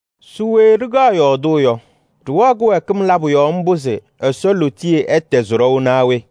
Se we ɖɩkaɣ yɔɔdʋʋ yɔ? Ɖɩwɛɣ kɩwɛɛkɩm labʋ yɔɔ mbʋ se Ɛsɔ lootiye ɛtɛzɩ ɖɔʋ naa we?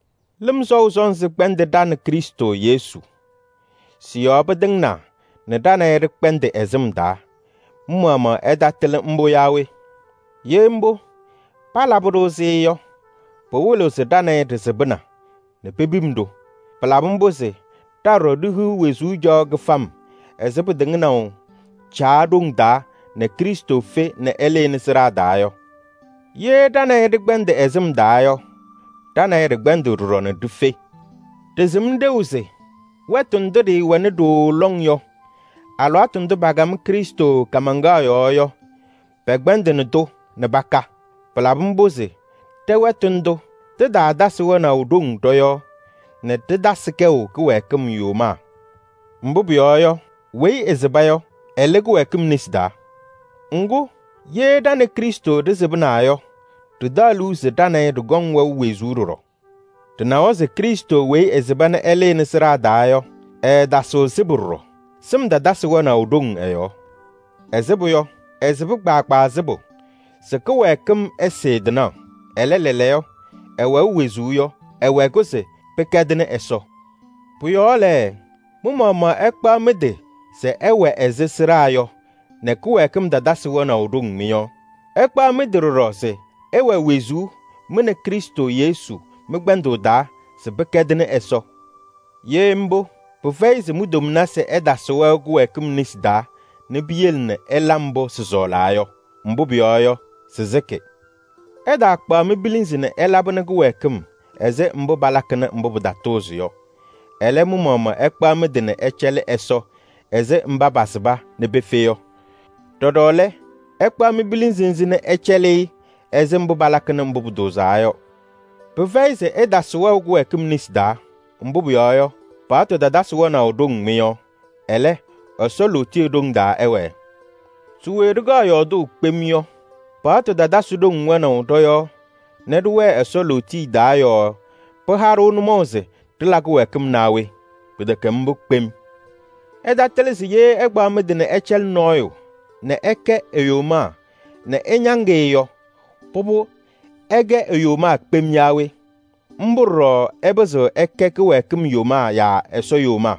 Lɩm sɔʋ sɔnzɩ kpɛndɩnɩ ɖa nɛ Krɩstʋ Yesu. Sɩ-yɔɔ pɩtɩŋnaa nɛ ɖa nɛ ɩ ɖɩkpɛndɩ ɛ-sɩm taa. Mɩ-maɣmaɣ ɩtatɩlɩ mbʋ yaa we? Ye mbʋ, palabɩ-ɖʋ-sɩ yɔ, pɩwɩlɩɣ se ɖa nɛ ɩ ɖɩsɩbɩna nɛ pepim-ɖʋ. Pɩlabɩ mbʋ se ɖa ɖɔɖɔ ɖihiɣ wezuu caɣʋ kɩfam ɛzɩ pɩtɩŋnaʋ Caa ɖoŋ taa nɛ Krɩstʋ fe nɛ ɛlɩnɩ sɩɖaa taa yɔ. Ye ɖa nɛ ɩ ɖɩkpɛndɩ ɛ-sɩm taa yɔ, ɖa nɛ ɩ ɖɩkpɛndɩɣ ɖɔɖɔ ɖife. Ɖɩsɩm ɖeu se: wɛtʋ ndʋ ɖɩɩwɛna ɖooo lɔŋ yɔ, alɩwaatʋ ndʋ pakam Krɩstʋ kaamaŋkaɣ yɔɔ yɔ, pɛkpɛndɩnɩ-tʋ nɛ paka. Pɩlabɩ mbʋ se ɖɛ-wɛtʋ ndʋ, tɩtaatasɩ wɛnaʋ ɖoŋ ɖɔ-yɔɔ nɛ ɖɩtasɩ kɛʋ kɩwɛɛkɩm yomaa. Mbʋ pʋyɔɔ yɔ, weyi ɛsɩba yɔ, ɛlɩ kɩwɛɛkɩm nesi taa. Ŋgʋ, ye ɖa nɛ Krɩstʋ ɖɩsɩbɩna yɔ, ɖɩtaɣ liu se ɖa nɛ ɩ ɖɩkɔŋ wɛʋ wezuu ɖɔɖɔ. Ɖɩnawa se Krɩstʋ weyi ɛsɩba nɛ ɛlɩnɩ sɩɖaa taa yɔ, ɛɛtasɩɣ sɩbʋ ɖɔɖɔ. Sɩm tatasɩ wɛnaʋ ɖoŋ ɛ-yɔɔ. Ɛsɩbʋ yɔ, ɛsɩba kpaagbaa sɩbʋ se kɩwɛɛkɩm ɛsɩɩ tɩnaɣ. Ɛlɛ, lɛɛlɛɛyɔ ɛwɛʋ wezuu yɔ, ɛwɛ-kʋ se pɩkɛdɩnɩ Ɛsɔ. Pʋ-yɔɔ lɛ, mɩ-maɣmaɣ ɩkpaɣ mɩ-tɩ se ɩwɛ ɛzɩ sɩɖaa yɔ nɛ kɩwɛɛkɩm tatasɩ wɛnaʋ ɖoŋ mɩ-yɔɔ. Ɩkpaɣ mɩ-tɩ ɖɔɖɔ se ɩwɛ wezuu mɩ nɛ Krɩstʋ Yesu mɩ-kpɛndʋʋ taa se pɩkɛdɩnɩ Ɛsɔ. Ye mbʋ, pɩfɛyɩ se mi-tomnasɩ ɛtasɩ wɛʋ kɩwɛɛkɩm nesi taa nɛ piyele nɛ ɩla mbʋ sɩsɔɔlaa yɔ. Mbʋ pʋyɔɔ yɔ, sɩsɩkɩ. Ɩtaakpaɣ mi-pilinzi nɛ ɩlabɩnɩ kɩwɛɛkɩm ɛzɩ mbʋ palakɩnɩ mbʋ pɩtatʋʋzɩ yɔ. Ɛlɛ, mɩ-maɣmaɣ ɩkpaɣ mɩ-tɩ nɛ ɩcɛlɩ Ɛsɔ ɛzɩ mba pasɩba nɛ pefe yɔ. Ɖɔɖɔ lɛ, ɩkpaɣ mi-pilinzi nzɩ nɛ ɩcɛlɩ-ɩ ɛzɩ mbʋ palakɩnɩ mbʋ pʋtʋʋzaa yɔ. Pɩfɛyɩ se ɩtasɩ wɛʋ kɩwɛɛkɩm nesi taa, mbʋ pʋyɔɔ yɔ, paɣtʋ tatasɩ wɛnaʋ ɖoŋ mɩ-yɔɔ. Ɛlɛ, Ɛsɔ lootiye ɖoŋ taa ɩwɛɛ. Se we ɖɩkaɣ yɔɔdʋʋ kpem yɔ? Paɣtʋ tatasɩ ɖoŋ wɛnaʋ ɖɔ-yɔɔ nɛ ɖɩwɛɛ Ɛsɔ lootiye taa yɔɔ pɩha-ɖʋ nʋmɔʋ se ɖɩla kɩwɛɛkɩm naa we? Pɩtɛkɛ mbʋ kpem! Ɩtatɩlɩ se ye ɩkpaɣ mɩ-tɩ nɛ ɩcɛlɩ nɔɔyʋ nɛ ɩkɛ e-yomaa nɛ ɩñaŋ-ɩ yɔ, pʋbʋ, ɩkɛ e-yomaa kpem yaa we? Mbʋ ɖɔɖɔ ɩpɩzɩɣ ɩkɛ kɩwɛɛkɩm yomaa yaa Ɛsɔ yomaa.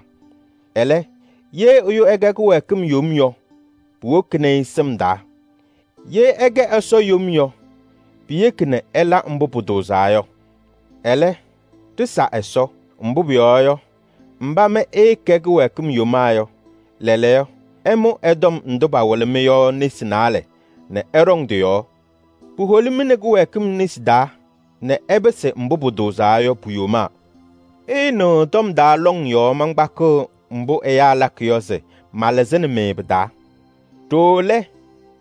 Ɛlɛ, ye ɛyʋ ɛkɛ kɩwɛɛkɩm yom yɔ, puwokini-i sɩm taa. Ye ɛkɛ Ɛsɔ yom yɔ, piyeki nɛ ɛla mbʋ pʋtʋʋzaa yɔ. Ɛlɛ, ɖɩsa Ɛsɔ. Mbʋ pʋyɔɔ yɔ, mba mɩ ɩɩkɛ kɩwɛɛkɩm yomaa yɔ, lɛɛlɛɛyɔ, ɩmʋ tɔm ndʋ pawɩlɩ-mɩ yɔ nesi naalɛ nɛ ɩɖɔŋ tɩ-yɔɔ. Puholi-mɩ nɛ kɩwɛɛkɩm nesi taa nɛ ɩpɩsɩ mbʋ pʋtʋʋzaa yɔ pu-yomaa. Ɩɩnɩɣ tɔm taa lɔŋ yɔɔ mankpakɩɣ mbʋ ɛyaa lakɩ yɔ se malɩzɩnɩ-mɩ pɩ-taa. Ɖooo lɛ,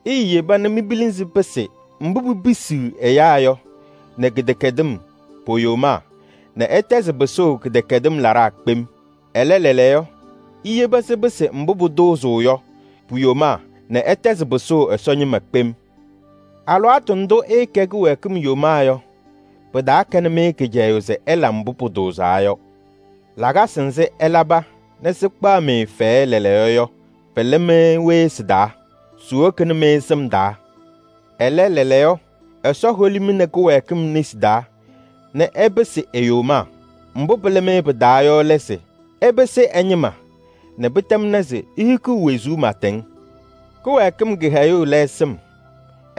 iiyeba nɛ mi-pilinzi pɩsɩ mbʋ pipisiɣ ɛyaa yɔ nɛ kɩdɛkɛdɩm po-yomaa nɛ ɩtɛzɩ pɩsʋʋ kɩdɛkɛdɩm laɖaa kpem. Ɛlɛ, lɛɛlɛɛyɔ, iyebi sɩpɩsɩ mbʋ pʋtʋʋzaa yɔ pu-yomaa nɛ ɩtɛzɩ pɩsʋʋ Ɛsɔ ñɩma kpem. Alɩwaatʋ ndʋ ɩɩkɛ kɩwɛɛkɩm yomaa yɔ, pɩtaakɛnɩ-mɩ kɩcɛyʋʋ se ɩla mbʋ pʋtʋʋzaa yɔ. Lakasɩ nzɩ ɩlaba nɛ sɩkpaɣ-mɩ fɛyɛ lɛɛlɛɛyɔ yɔ, pɩlɩ-mɩ we sɩ-taa? Siwokini-mɩ sɩm taa! Ɛlɛ, lɛɛlɛɛyɔ, Ɛsɔ holi-mɩ nɛ kɩwɛɛkɩm nesi taa nɛ ɩpɩsɩ e-yomaa. Mbʋ pɩlɩ-mɩ pɩ-taa yɔ lɛ se ɩpɩsɩ ɛ-ñɩma nɛ pɩtɛmna se ihikiɣ wezuu pɩɩtɛŋ. Kɩwɛɛkɩm kɩhɛyʋʋ lɛ sɩm.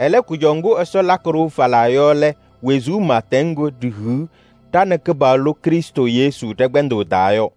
Ɛlɛ, kʋjɔʋ ŋgʋ Ɛsɔ lakɩ-ɖʋ falaa yɔ lɛ wezuu pɩɩtɛŋ ŋgʋ ɖihiɣ ɖa nɛ ɖa-Kɩpaɣlʋ Krɩstʋ Yesu ɖɛ-kpɛndʋʋ taa yɔ.